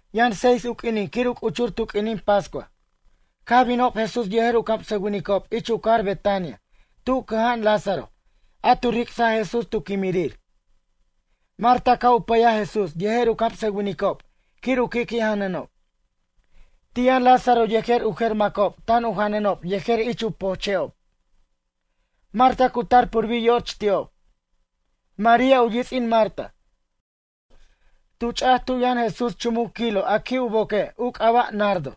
Yʌn seis u q'uinin quir u c'uchur tu q'uinin pascua. Caj binob Jesús yejer u camsʌwinicob ich u cajar Betania tu cʌja'an Lázaro a tu ric'saj Jesús tu quimirir. Marta caj u pʌyaj Jesús yejer u camsʌwinicob quir u qui' janʌnob. Ti' yʌn Lázaro yejer u jer macob tan u janʌnob yejer ich u pojche'ob. Marta cu tar purbir yoch ti'ob. María, u yits'in Marta, tu ch'aj tu' yʌn Jesús chumuc kilo a qui' u boque' u c'aba' nardo.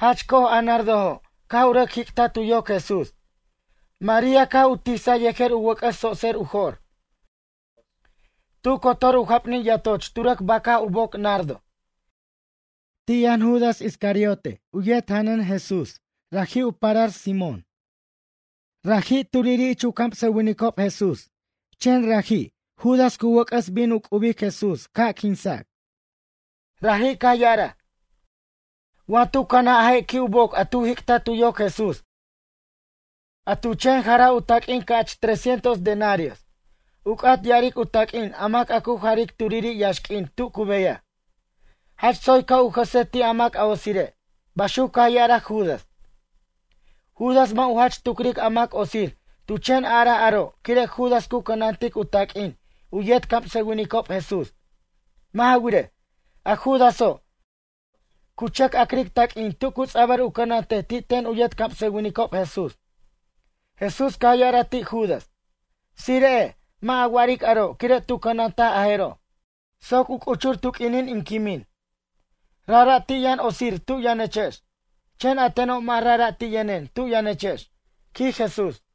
Jach co'oj a nardojo' caj u rʌc jic'taj tu yoc Jesús, María caj u tisaj yejer u wʌc'ʌs tsotser u jo'r. Tu cotor u japnin yatoch tu rʌc bac'aj u boc nardo. Ti' yʌn Judas Iscariote u yet janʌn Jesús, raji' u parar Simón Iscariote. Raji' turiri' ich u camsʌwinicob Jesús chen raji', Judas, cu wʌc'ʌs bin u c'ubic Jesús ca' quinsac. Raji' caj ya'araj: ―Wa tu canaj a je' qui' u boc a tu jic'taj tu yoc Jesús, a tu chen jaraj u taq'uin ca'ch tres cientos denarios ―u c'at ya'aric u taq'uin a mac a cu jaric turiri' yaxq'uin tu cu beyaj―. Jach tsoy ca' u jʌsej ti' a mac otsire' ―baxuc caj ya'araj Judas. Judas mʌ' u jach tucric a mac otsir tu chen araj aro' quire' Judas cu cʌnantic u taq'uin u yet camsʌwinicob Jesús. Mʌ' ja wirej, a Judaso', cu chʌc a'cric taq'uin tu cu ts'abʌr u cʌnantej ti' ten u yet camsʌwinicob Jesús. Jesús caj ya'araj ti' Judas: ―Tsire'ej mʌ' a wa'aric aro' quire' tu cʌnantaj a jeroj soc u c'uchur tu q'uinin in quimin. Rajra' ti' yʌn otsir tu' yʌnechex. Chen a teno' mʌ' rajra' ti' yʌnen tu' yʌnechex ―quij Jesús.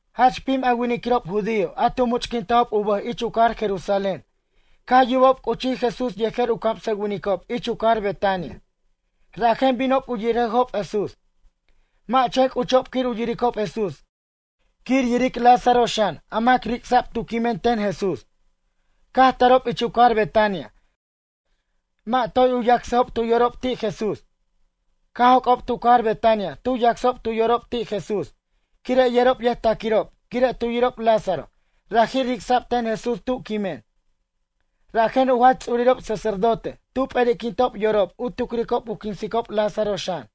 Jach pim a winiquirob judío a tu much'quintajob u bʌj ich u cajar Jerusalén caj yubob c'uchij Jesús yejer u camsʌwinicob ich u cajar Betania. Rajen binob u yirejob Jesús. Mʌ' chen c'uchob quir u yiricob Jesús quir yiric Lázaro xan a mac ric'sa'b tu' quimen ten Jesús. Caj tarob ich u cajar Betania mʌ' toy u yacsajob tu yorob ti' Jesús. Caj joc'ob tu cajar Betania tu yacsob tu yorob ti' Jesús quire' yerob yʌjtaquirob quire' tu yirob Lázaro raji' ric'sa'b ten Jesús tu' quimen. Rajen u jach ts'urirob sacerdote tu p'eri'quintob yorob u tucricob u quinsicob Lázaro xan.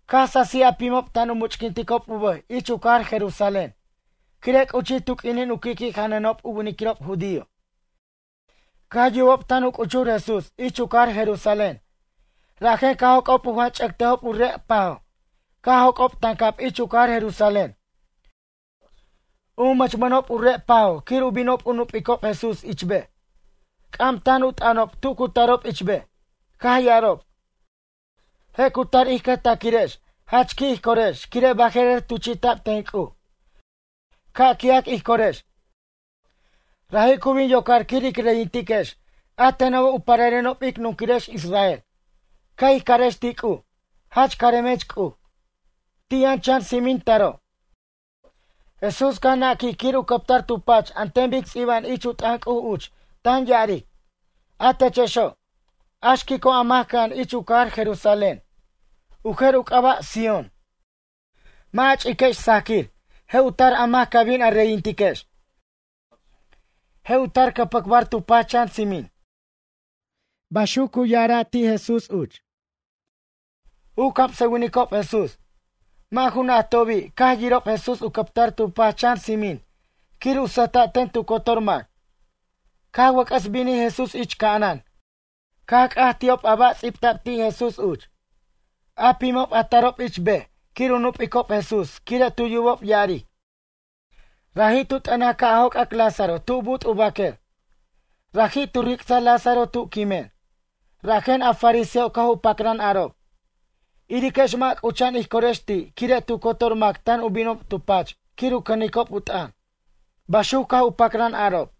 Caj sasij a pimob tan u much'quinticob u bʌj ich u cajar Jerusalén quire' c'uchij tu q'uinin u qui'qui' janʌnob u winiquirob judío. Caj yubob tan u c'uchur Jesús ich u cajar Jerusalén. Rajen caj joc'ob u janch'ʌtejob u re' pajo' caj joc'ob tancab ich u cajar Jerusalén. U mʌchmʌnob u re' pajo' quir u binob u nup'icob Jesús ich bej. C'am tan u t'ʌnob tu cu tarob ich bej. Caj ya'arob: ―Je' cu tar ij cʌjtaquirex jach qui' ij corex quire' baje'rer tuchi'ta'b ten C'uj. Ca' qui'ac ij corex. Raji' cu bin yocar quir ic reyintiquex a tenobo' u pararenob ic nunquirex Israel. Ca' ij carex ti' C'uj: “Jach caremech C'uj.” Ti' yʌn chan tsimin taro'. Jesús caj naquij quir u cʌptar tu pach an ten bic ts'iba'an ich u t'ʌn C'uj uch tan ya'aric: A techexo', a xquico' a mac cʌja'an ich u cajar Jerusalén, u jer u c'aba' Sión, mʌ' a ch'iquex sajaquir, je' u tar a mac ca' bin a reyintiquex. Je' u tar cʌpʌcbar tu pach chan tsimin. Baxuc cu ya'ara' ti' Jesús uch. U camsʌwinicob Jesús, mʌ' ju najtobi' caj yirob Jesús u captar tu pach chan tsimin quir u sʌjta' ten tu cotor mac. Caj wʌc'ʌs binij Jesús ich ca'anan caj c'aj ti'ob a ba' ts'ibta'b ti' Jesús uch. A pimob a tarob ich bej quir u nup'icob Jesús quire' tu yubob ya'aric: “Raji' tu t'ʌnaj ca' joc'ac Lázaro tu but' u baquer. Raji' tu ric'saj Lázaro tu' quimen.” Rajen a fariseojo' caj u pacran arob: ―Iriquex mʌ' c'ucha'an ij corex ti' quire' tu cotor mac tan u binob tu pach quir u cʌnicob u t'ʌn ―baxuc caj u pacran arob.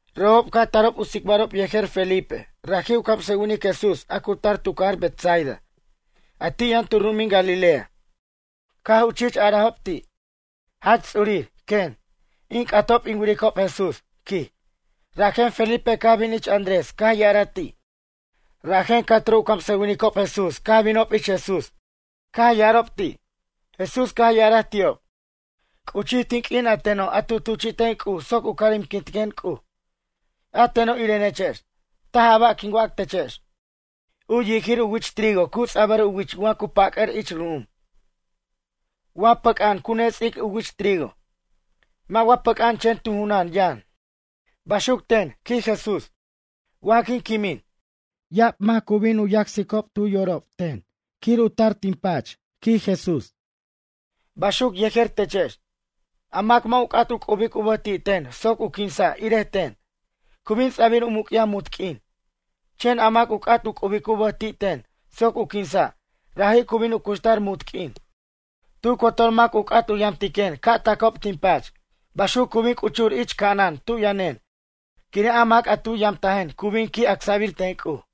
Robob caj tarob u tsicbarob yejer Felipe. Raji' u camsʌwinic Jesús a cu tar tu cajar Betsaida a ti' yʌn tu ru'umin Galilea, caj u chich arajob ti': ―Jach ts'urir, quen, in c'atob in wiricob Jesús ―quij. Rajen Felipe caj bin ich Andrés caj ya'araj ti'. Rajen ca'turo' u camsʌwinicob Jesús caj binob ich Jesús caj ya'arob ti'. Jesús caj ya'araj ti'ob: ―C'uchij tin q'uin a teno' a tu tuchi'ten C'uj soc u caremquintiquen C'uj, a teno' irenechex. Taj a ba' quin wac techex, u yijir u wich trigo cu ts'abʌr u wich wa cu pʌc'ʌr ich ru'um. Wa pʌc'a'an cu nets'ajic u wich trigo. Wa mʌ' pʌc'a'an chen tu junan yʌn. Baxuc ten ―quij Jesús―, wa quin quimin, ya'ab mac cu bin u yacsicob tu yorob ten quir u tar tin pach ―quij Jesús―. Baxuc yejer techex. A mac mʌ' u c'at u c'ubic u bʌj ti' ten soc u quinsa' irej ten, cu bin ts'abir u muc'yaj munt q'uin. Chen a mac u c'at u c'ubic u bʌj ti' ten soc u quinsa', raji' cu bin u cuxtar munt q'uin. Tu cotor mac u c'at u yamtiquen ca' tacob tin pach. Baxuco' cu bin c'uchur ich ca'anan tu' yʌnen quire' a mac a tu yamtajen cu bin qui' acsa'bir ten C'uj.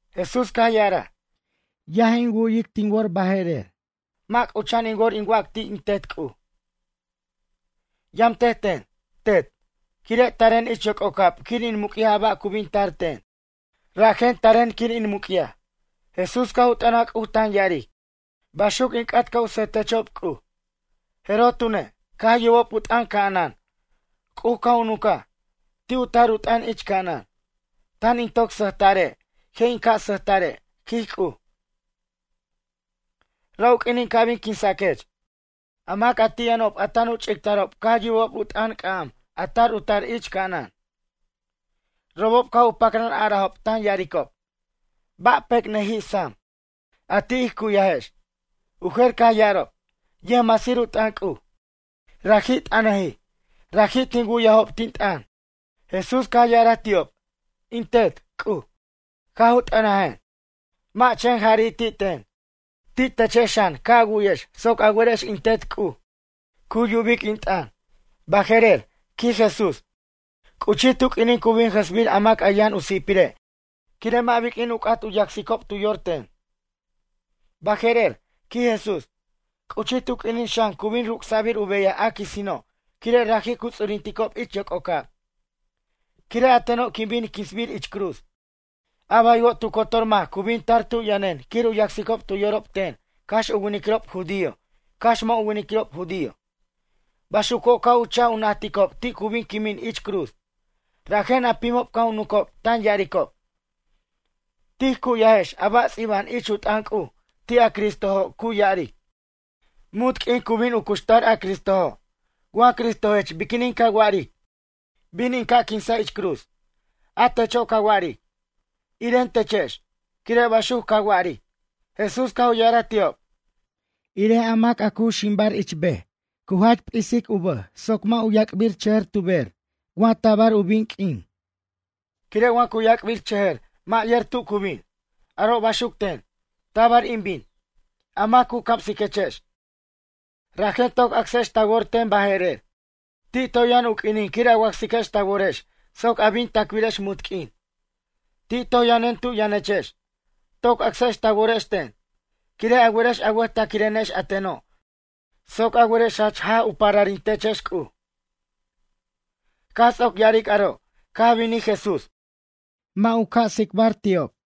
Jesús caj ya'araj: ―Yaj in wu'yic tin wor baje'rer. Mʌ' c'ucha'an in wor in wac ti' in Tet C'uj: “Yʌmtej ten, Tet”, quire' taren ich yoc'ocab quir in muc'yaj a ba' cu bin tar ten. Rajen taren quir in muc'yaj. Jesús caj u t'ʌnaj C'uj tan ya'aric: ―Baxuc in c'at ca' u sʌj techob C'uj. Jeroj tune', caj yubob u t'ʌn ca'anan. C'uj caj u nuncaj, ti' u tar u t'ʌn ich ca'anan: ―Tan in toc sʌjta're', je' in ca' sʌjta're' ―quij C'uj―, ra' u q'uinin ca' bin quinsaquech. A mac a ti' yʌnob a tan u ch'ictarob caj yubob u t'ʌn c'am a tar u tar ich ca'anan. Robob caj u pacran arajob tan ya'aricob: ―Ba' pecnʌjij sam, a ti' ij cu'yajex? U jer caj ya'arob: ―Yʌjmasir u t'ʌn C'uj, raji' t'ʌnʌjij. Raji' tin wu'yajob, tin t'ʌn. Jesús caj ya'araj ti'ob: ―In Tet, C'uj, caj u t'ʌnajen, mʌ' chen jari' ti' ten, ti' techex xan ca' a wu'yex soc a werex in Tet, C'uj, cu yubic in t'ʌn. Baje'rer ―quij Jesús―, c'uchij tu q'uinin cu bin jʌsbir mac a yʌn u si'pire' quire' mʌ' biq'uin u c'at yacsicob tu yor ten. Baje'rer ―quij Jesús―, c'uchij tu q'uinin xan cu bin ruc'sa'bir u beyaj a quisino' quire' raji' cu ts'urinticob ich yoc'ocab. Quire' a teno' quin bin quinsbir ich cruz. A baywo' tu cotor mac cu bin tar tu' yʌnen quir u yacsicob tu yorob ten cax u winiquirob judío cax mʌ' u winiquirob judío. Baxuco' ca' u chaj u najticob ti' cu bin quimin ich cruz. Rajen a pimob caj u nuncob tan ya'aricob: ―Tij cu'yajex a ba' ts'iba'an ich u t'ʌn C'uj ti' a Cristojo' cu ya'aric: “Munt q'uin cu bin u cuxtar a Cristojo'.” Wa Cristojech biquinin ca wa'aric: “Bin in ca' quinsa' ich cruz?” A techo' ca wa'aric: “Iren techex”, quire' baxuc ca wa'aric. Jesús caj u ya'araj ti'ob: ―Irej a mac a cu ximbar ich bej, cu jach p'isic u bʌj soc mʌ' u yac'birchʌjʌr tu bej wa tabar u bin q'uin. Quire' wa cu yac'birchʌjʌr mʌ' yer tu cu bin. Aro' baxuc ten, tabar in bin, a mac cu camsiquechex. Rajen toc acsex ta wor ten baje'rer. Ti' toy yʌn u q'uinin quir a wacsiquex ta worex soc a bin tacbirex munt q'uin. Ti' toj yʌnen tu' yʌnechex, toc acsex ta worex ten. Quire' a werex a wʌjtaquirenex a teno' soc a werex jach jaj u pararintechex C'uj. Caj ts'oc ya'aric aro' caj binij Jesús. Mʌ' u ca' u tsicbar ti'ob.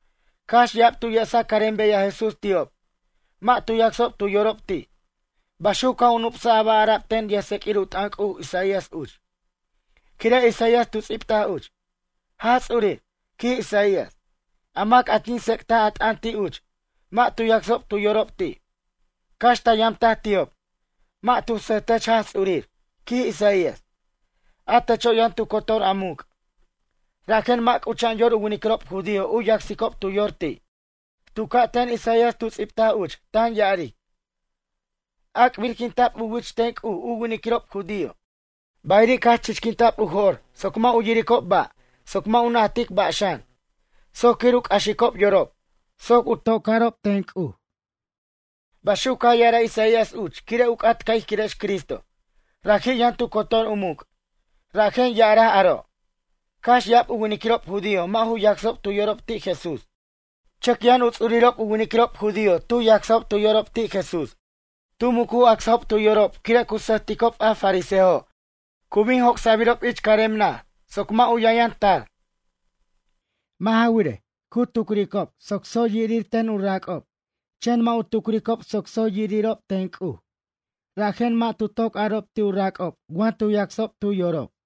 Cax ya'ab tu yesaj carem beyaj Jesús ti'ob, mʌ' tu yacsob tu yorob ti'. Baxuc caj u nup'saj a ba' ara'b ten yʌjtseq'uir u t'ʌn C'uj Isaías uch. Quire' Isaías tu ts'ibtaj uch: Jaj Ts'urir, quij Isaías, a mac a tin tsec'taj a t'ʌn ti' uch, mʌ' tu yacsob tu yorob ti'. Cax ta yamtaj ti'ob, mʌ' tu sʌjtech Jaj Ts'urir, quij Isaías. A techo' yʌn tu cotor a muc'. Rajen mʌ' c'ucha'an yor u winiquirob judío u yacsicob tu yor ti'. Tu ca' ten Isaías tu ts'ibtaj uch tan ya'aric: Ac'birquinta'b u wich ten C'uj u winiquirob judío, bayiri' caj chichquinta'b u jo'r soc mʌ' u yiricob ba' soc mʌ' u najtic ba' xan, soc quir u c'axicob yorob, soc u to'carob ten C'uj. Baxuc caj ya'araj Isaías uch quire' u c'at ca' ij quirex Cristo, raji' yʌn tu cotor u muc'. Rajen ya'araj aro'. Cax ya'ab u winiquirob judío mʌ' ju yacsob tu yorob ti' Jesús. Chʌc yʌn u ts'urirob u winiquirob judío tu yacsajob tu yorob ti' Jesús. Tu muc u acsajob tu yorob quire' cu sʌjticob a fariseo cu bin joc'sabirob ich carem naj soc mʌ' u yʌnyʌn tar. Mʌ' ja wirej, cu tucricob soc tsoy irir ten u rac'ob chen mʌ' u tucricob soc tsoy irirob ten C'uj, rajen mʌ' tu toc arob ti' u rac'ob wa tu yacsob tu yorob.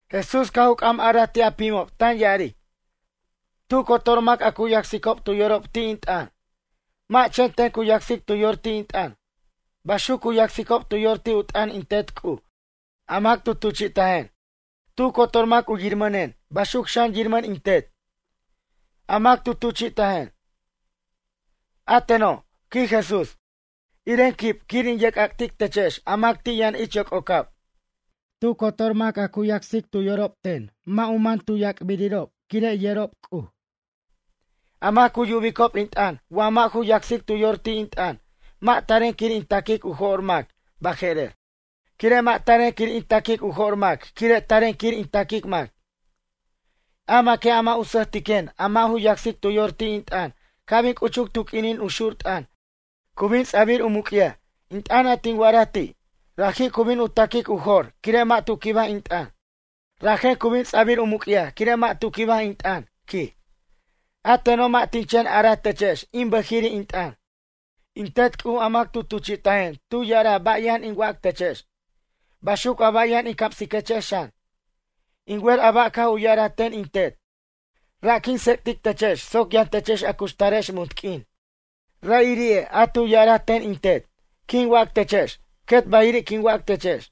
Jesús caj u c'am araj ti' a pimo' tan ya'aric: ―Tu cotor mac a cu yacsicob tu yorob ti' in t'ʌn, mʌ' chen ten cu yacsic tu yor ti' in t'ʌn. Baxuc cu yacsicob tu yor ti' u t'ʌn in Tet C'uj a mac tu tuchi'tajen. Tu cotor mac u yirmʌnen baxuc xan yirmʌn in Tet, a mac tu tuchi'tajen. A teno' ―quij Jesús―, iren quib quir in yerc'ac'tic techex a mac ti' yʌn ich yoc'ocab. Tu cotor mac a cu yacsicob tu yorob ten mʌ' u mʌn tu yac'birirob quire' yerob C'uj. A mac cu yubicob in t'ʌn wa mʌ' ju yacsic tu yor ti' in t'ʌn mʌ' taren quir in taquic u jo'r mac baje'rer. Quire' mʌ' taren quir in taquic u jo'r mac quire' taren quir in taquic mac. A maque' a mʌ' u sʌjtiquen a mʌ' ju yacsic tu yor ti' in t'ʌn ca' bin c'uchuc tu q'uinin u xur t'ʌn cu bin ts'abir u muc'yaj in t'ʌn a tin wa'araj ti'. Raji' cu bin u ta'quic u jo'r quire' mʌ' tu quibaj in t'ʌn. Rajen cu bin ts'abir u muc'yaj quire' mʌ' tu quibaj in t'ʌn ―quij―. A teno' mʌ' tin chen araj techex in bʌjiri' in t'ʌn. In Tet C'uj a mac tu tuchi'tajen tu ya'araj ba' yʌn in wac techex. Baxuc a ba' yʌn in camsiquechex xan. In wer a ba' caj u ya'araj ten in Tet, ra' quin tsec'tic techex soc yʌn techex a cuxtarex munt q'uin. Ra'iri'e' a tu ya'araj ten in Tet, quin wac techex, quet bayiri' quin wac techex.